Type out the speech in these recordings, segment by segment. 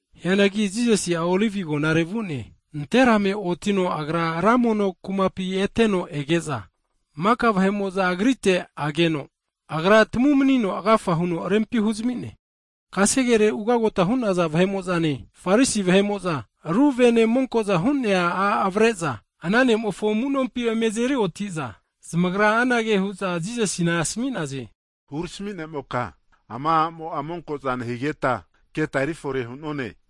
Hianagi Jisasi'a Olivi Agonare vu'ne. Nanterame otino Agra ra mono kumapi eteno ege'za, maka vahe'mo'za Agrite ageno, Agra tamumnino agafa huno rempi huzami'ne. Kasegere ugagota hu'naza vahe'mo'zane, Farisi vahe'mo'za ru vene monko'za hu'nea a' avare'za, ana nomofo amu'nompi eme azeri oti'za, zamagra anage hu'za Jisasina asmi'naze, Hurami ne'moka, ama a'mo'a monko'za nehigeta keta eri fore hu'none.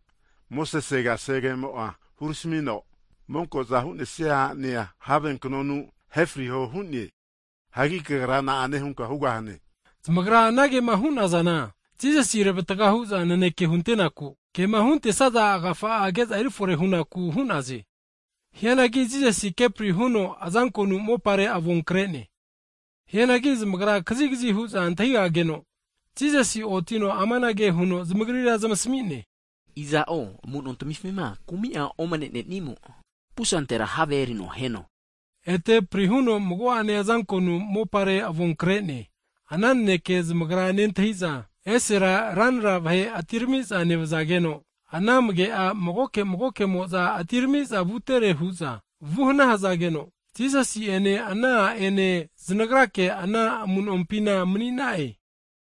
Mosese kasegemo'a huramino, monko'za hu'nesia a'nea, have knonu ahe friho hu'ne. Hagi Kagra na'ane hunka hugahane? Zamagra anagema hu'nazana Jisasi revatga hu'za naneke huntenaku, kema huntesaza agafa'a keza eri fore hunaku hu'naze. Hianagi Jisasi kepri huno azankonu mopare avon kre'ne. Hianagi zamagra kazigzi hu'za antahi'negageno, Jisasi otino amanage huno zamagrira zamasmi'ne, aza'o amu'nontamifi'ma kumi'a omne'nenimo, pusantera havea erino aheno. Ete pri huno mago'ane azankonu mopare avon kre'ne. Ana naneke zamagra nentahi'za, esera ranra vahe atirami'za nevzageno, ana amage'a magoke magoke'mo'za atirami'za vutere hu'za vuhna hzageno, Jisasi'ene ana a' ene znagrake anampina mani'na'e.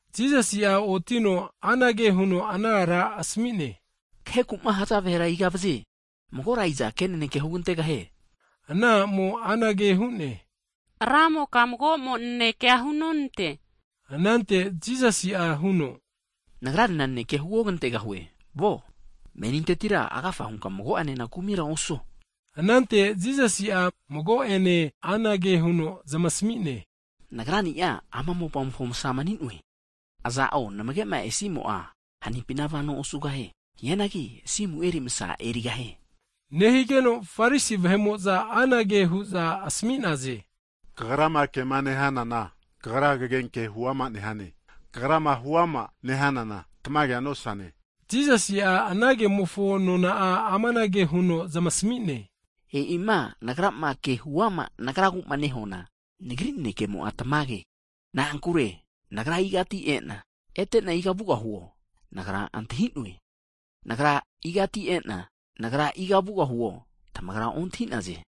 Jisasi'a otino anage huno ana ara asmi'ne, kaheku'ma haza vahera iga vaze? Magora iza ke naneke hugantegahie? Ana a'mo anage hu'ne, Ramoka mago'mo nanekea hunonante, anante Jisasi'a huno nagranena nanekea huogantegahue. Kagra nevunka, menintetira agafa hunka mago'ene kumira osuo.] Anante Jisasi'a mago'ene anage huno zamasmi'ne, Nagra'ni'a ama mopamofo Msa mani'noe, aza'o namge'ma esimo'a hanimpina vano osugahie. Hianagi asimu eri Msa erigahie. Nehigeno Farisi vahe'mo'za anage hu'za asmi'naze, Kagrama kema nehanana, Kagra kagenke huama nehane, Kagrama huama nehanana tamagea nosane. Jisasi'a anankemofo nona'a amanage huno zamasmi'ne, e'ima Nagrama ke huama Nagragu'ma nehuana, Nagri nanekemo'a tamage, na'ankure Nagra igati e'na, ete'na iga vugahuo, Nagra antahi'noe, hianagi Nagra igati e'na, iga Nagra vugahuo tamagra ontahi'naze.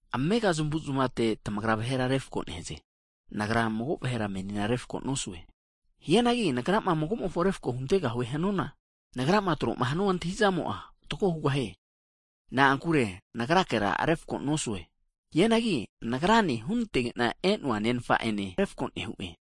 Amega zamuzmate tamagra vahera refko nehaze, Nagra mago vahera menina refko nosue. Hianagi Nagrama mago'mofo refko huntegahue hanuana, Nagrama troma hanua antahi'zamo'a fatgo hugahie, na'ankure Nagrakera refko nosue, hianagi Nagrane hunantege'na e'noa Nenfa ene refko nehu'e.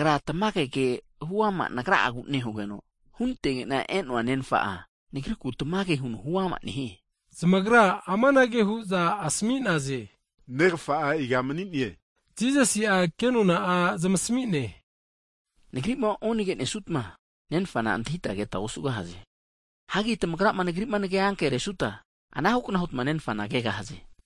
Nagra tamage ke huama Nagrani'agu nehugeno, hunantegena e'noa Nenfa'a Nagriku tamage huno huama nehie. Zamagra amanage hu'za asmi'naze, Negfa'a iga mani'ne? Jisasi'a kenona'a zamasmi'ne, Nagri'ma onage nesnutma Nenfana antahita keta osugahaze, hagi tamagra ma Nagri'ma nage'anke resuta, anahu kna hutma Nenfana kegahaze.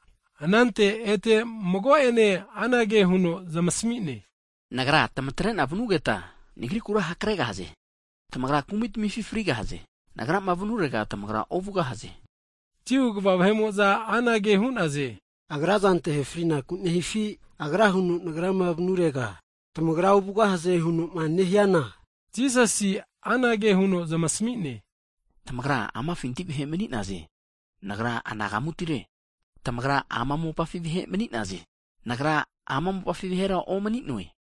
Anante ete mago'ene anage huno zamasmi'ne, Nagra tmatre'na vnugeta Nagrikura hakregahaze, tamagra kumi tmifi frigahaze, Nagrama vnurega tamagra ovugosaze. Jiu kva vahe'mo'za anage hu'naze, agrazante ahe fri'naku nehifi, Agra huno Nagrama vanurega, tamagra ovugahaze hunoma nehiana? Jisasi anage huno zamasmi'ne, tamagra amafinti vahe mani'naze, Nagra anagamutire, tamagra ama mopafi vahe mani'naze, Nagra ama mopafi vahera omni'noe.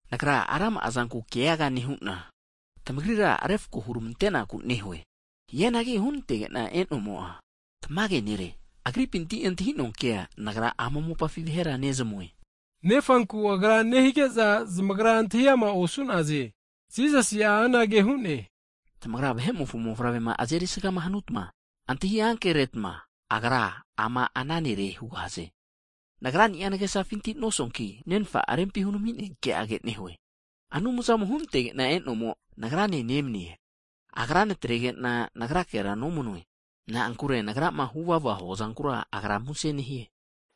Nagra rama'a zanku keaga nehu'na tamagrira refko hurmante'naku nehue. Hianagi hunantege'na e'nomo'a tamage Nere, Agripinti antahi'noa ke, Nagra ama mopafi vahera nezmasmue. Nefanku Agra nehige'za zamagra antahi ama osu'naze. Jisasi'a anage hu'ne, tamagrama Vahe'mofo Mofavrema azeri sgama hanutma, tamagra antahi ankeretma Agra ama ana Nere hugahaze, Nagra'ni'a nagesafintira nosuanki, Nenfa'ma rempi hunami'nea ke'age nehue. Anumzamo hunantege'na e'nomo, Nagrane nemnie, Agra natrege'na Nagrakera nomanue. Na'ankure Nagrama, Agri avesizama huvava huazankura, Agra muse nehie.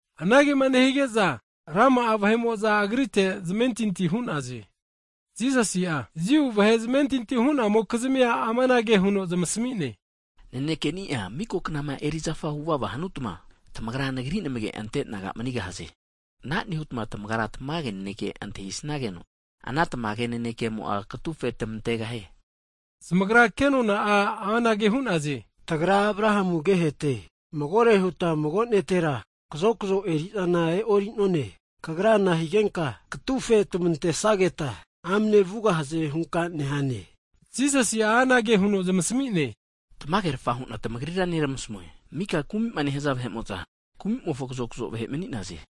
Anagema nehige'za rama'a vahe'mo'za Agrite zamentinti hu'naze. Jisasi'a, Jiu vahe zamentinti hu'namokizmia amanage huno zamasmi'ne, Nanekeni'a miko knama erizafa huvava hanuta, tamagra Nagri namage ante disaipol naga manigahaze. Ana nehutma tamagra tamage naneke antahisnageno, ana tamage nanekemo katufe tmantegahie. Zamagra kenona'a anage hu'naze, tagra Abrahamu agehete, magore huta mago netera kazokzo eri'zana e'ori'none, Kagra nahigenka katufe tmantesageta amne vugahaze hunka nehane? Jisasi'a anage huno zamasmi'ne, tamagerafa hu'na tamagrira nermasmue, maka kumi'ma nehza vahe'mo'za kumi'mofo kazokzo vahe mani'naze.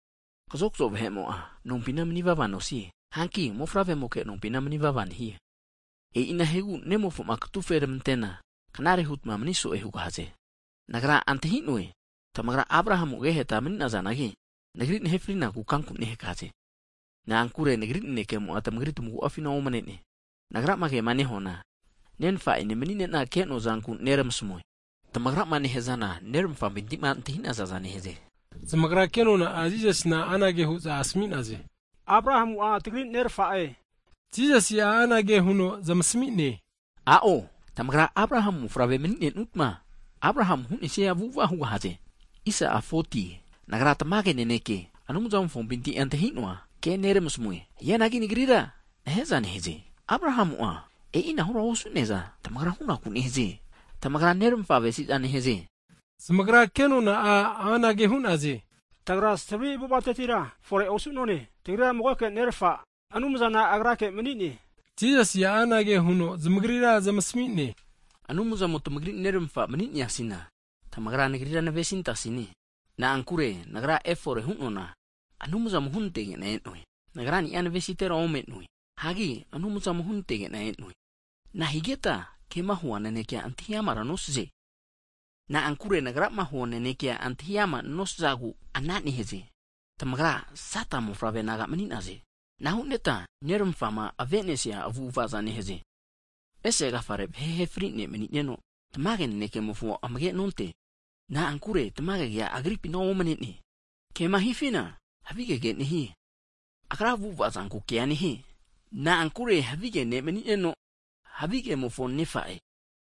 Kazokzo vahe'mo'a nompina manivava nosie, hanki mofavremoke nompina manivava nehie. E'inahigu Nemofo'ma katufe tmantena knare hutma mani so'e hugahaze. Nagra antahi'noe, tamagra Abrahamu ageheta mani'nazanagi' Nagri nahe frinaku kanku nehakaze, na'ankure Nagri nanekemo'a tamagri tamagu'afina omne'ne. Nagrama kema nehuana, Nenfa'ene mani'nena ke'noa zanku neramasmue, tamagrama nehazana neramafampinti'ma antahinazaza nehaze. Zamagra kenona'a Jisasina anage hu'za asmi'naze, Abrahamu'a tagri nerfa'e, Jisasi'a anage huno zamasmi'ne, a'o, tamagra ma Abrahamu mofavrema mani'nenutma Abrahamu hu'nesia avu'ava hugahaze. Nagra tamage naneke Anumza'mofompinti antahi'noa ke neramasmue, hianagi Nagrira nahe'za nehaze. Abrahamu'a e'inahura osu'neaza tamagra hunaku nehaze. Tamagra neramafa avesiza nehaze. Zamagra kenona'a anage hu'naze, tagra savri avu'avatetira fore osu'none, tagrira magoke Nerfa, Anumzana Agrake mani'ne. Jisasi'a anage huno zamagrira zamasmi'ne, Anumzamo'ma tmagri nerfa'ma mani'neasiana, tamagra Nagrira navesi nantasine, na'ankure Nagra efore hu'noana, Anumzamo hunantege'na e'noe. Nagrani'a navesitera ome'noe, hagi Anumzamo hunantege'na e'noe. Nahigeta kema hua nanekea antahi amara nosaze? Na'ankure Nagrama hua nanekea antahi ama nosazagu, ana nehaze. Tamagra Sata mofavre naga mani'naze, ana hunetma nermafa'ma avenesia avu'avaza nehaze. Ese agafare vahe ahe fri'nea ne' mani'neno, tamage nanekemofona amage nonte. Na'ankure tamage kea agripina omne'ne. Kema hifina, havigege nehie, agra avu'ava zanku kea nehie. Na'ankure havige ne' mani'neno, havigemofo nefa'e.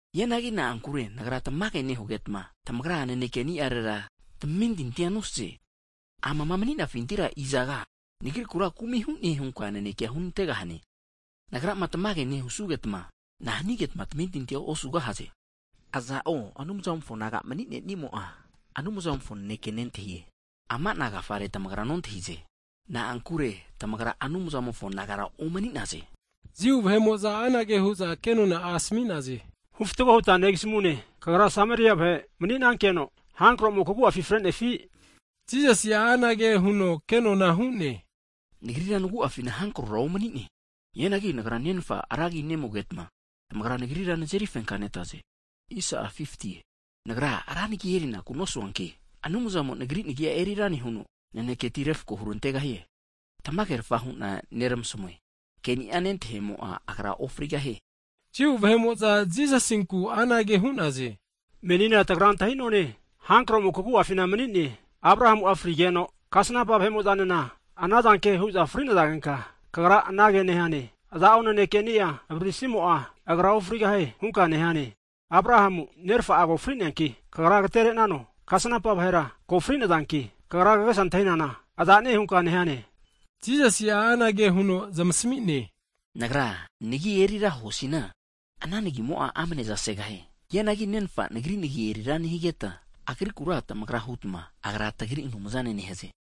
Hianagi na'ankure Nagra tamage nehugetma, tamagra nanekeni'arera tamentintia nosaze. Amama, mani'nafitira izaga Nagrikura kumi hu'ne hunka nanekea hunantegahane? Nagrama tamage nehusugetma, nahnigetma tamentintia osugahaze? Aza'o Anumzamofo naga mani'nenimo'a, Anumzamofo naneke nentahie, ama'na agafare tamagra nontahize. Na'ankure tamagra Anumzamofo nagara omni'naze. Jiu vahe'mo'za anage hu'za kenona'a asmi'naze, hufatgo huta negasmune, Kagra Sameria vahe mani'nankeno hankromo kagu'afi fre'nefi? Jisasi'a anage huno kenona hu'ne, Nagrira nagu'afina hankrora omni'ne, hianagi Nagra Nenfa ra agi nemugetma, tamagra Nagrira nazeri fenka nenatra'ze. Nagra ra nagi erinakura nosuanki, Anumzamo Nagri nagi'a eri ra nehuno, naneketi refko hurantegahie. Tamagerfa hu'na neramasmue, Keni'a nentahimo'a, agra ofrigahie. Jiu vahe'mo'za Jisasinku anage hu'za asami'naze, menina tagra antahi'none, hankromo kagu'afi mani'ne. Abrahamu'a fri'negeno, kasnampa vahe'mo'zanena anazanke hu'za fri'nazagenka, Kagra anage nehane, iza'o nanekeni'a avariri simo'a, agra ofrigahie hunka nehane. Abrahamu nerfa'a ko fri'neanki, Kagra agtere'nano? Kasnampa vahera ko fri'nazanki! Kagra kagesa antahinana aza'ne hunka nehane? Jisasi'a anage huno zamasmine, Nagra nagi erira hanuana, ana Nagimo'a amnezasegahie. Hianagi Nenfa'a Nagri nagi erira nehigeta, Agrikura tamagra hutma, Agra, tagri Anumzane nehaze.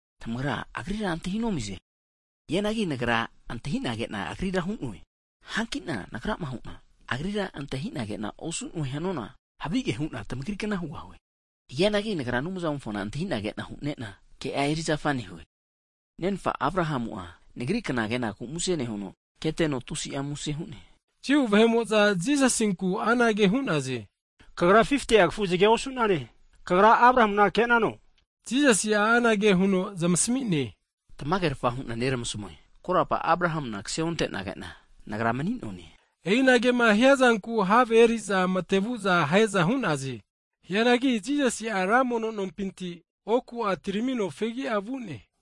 Tamagra Agrira antahinomize, hianagi Nagra antahi'na ke'na Agrira hu'noe, hankina Nagrama hu'na, Agrira antahi'na kena osu'noe hanuana, havige hu'na tmagrikna hugahue, hianagi Nagra Anumzamofona antahina kena hu'nena, ke'a erizafa nehue. Neramafa Abrahamu'a Nagri kna kenaku muse nehuno, keteno tusi'a muse hu'ne. Jiu vahe'mo'za Jisasinku anage hu'naze, Kagra 50'a kafuzge osu'nane, Kagra Abrahamuna ke'nano? Jisasi'a anage huno zamasmi'ne, tamagerafa hu'na neramasmue, korapa Abrahamuna kse onte'nage'na, Nagra mani'noane. E'inagema hiazanku have eri'za mate vuza ahe'za hu'naze. Hianagi Jisasi'a ra mono nompinti (tempol) oku'a atiramino fegi'a vu'ne.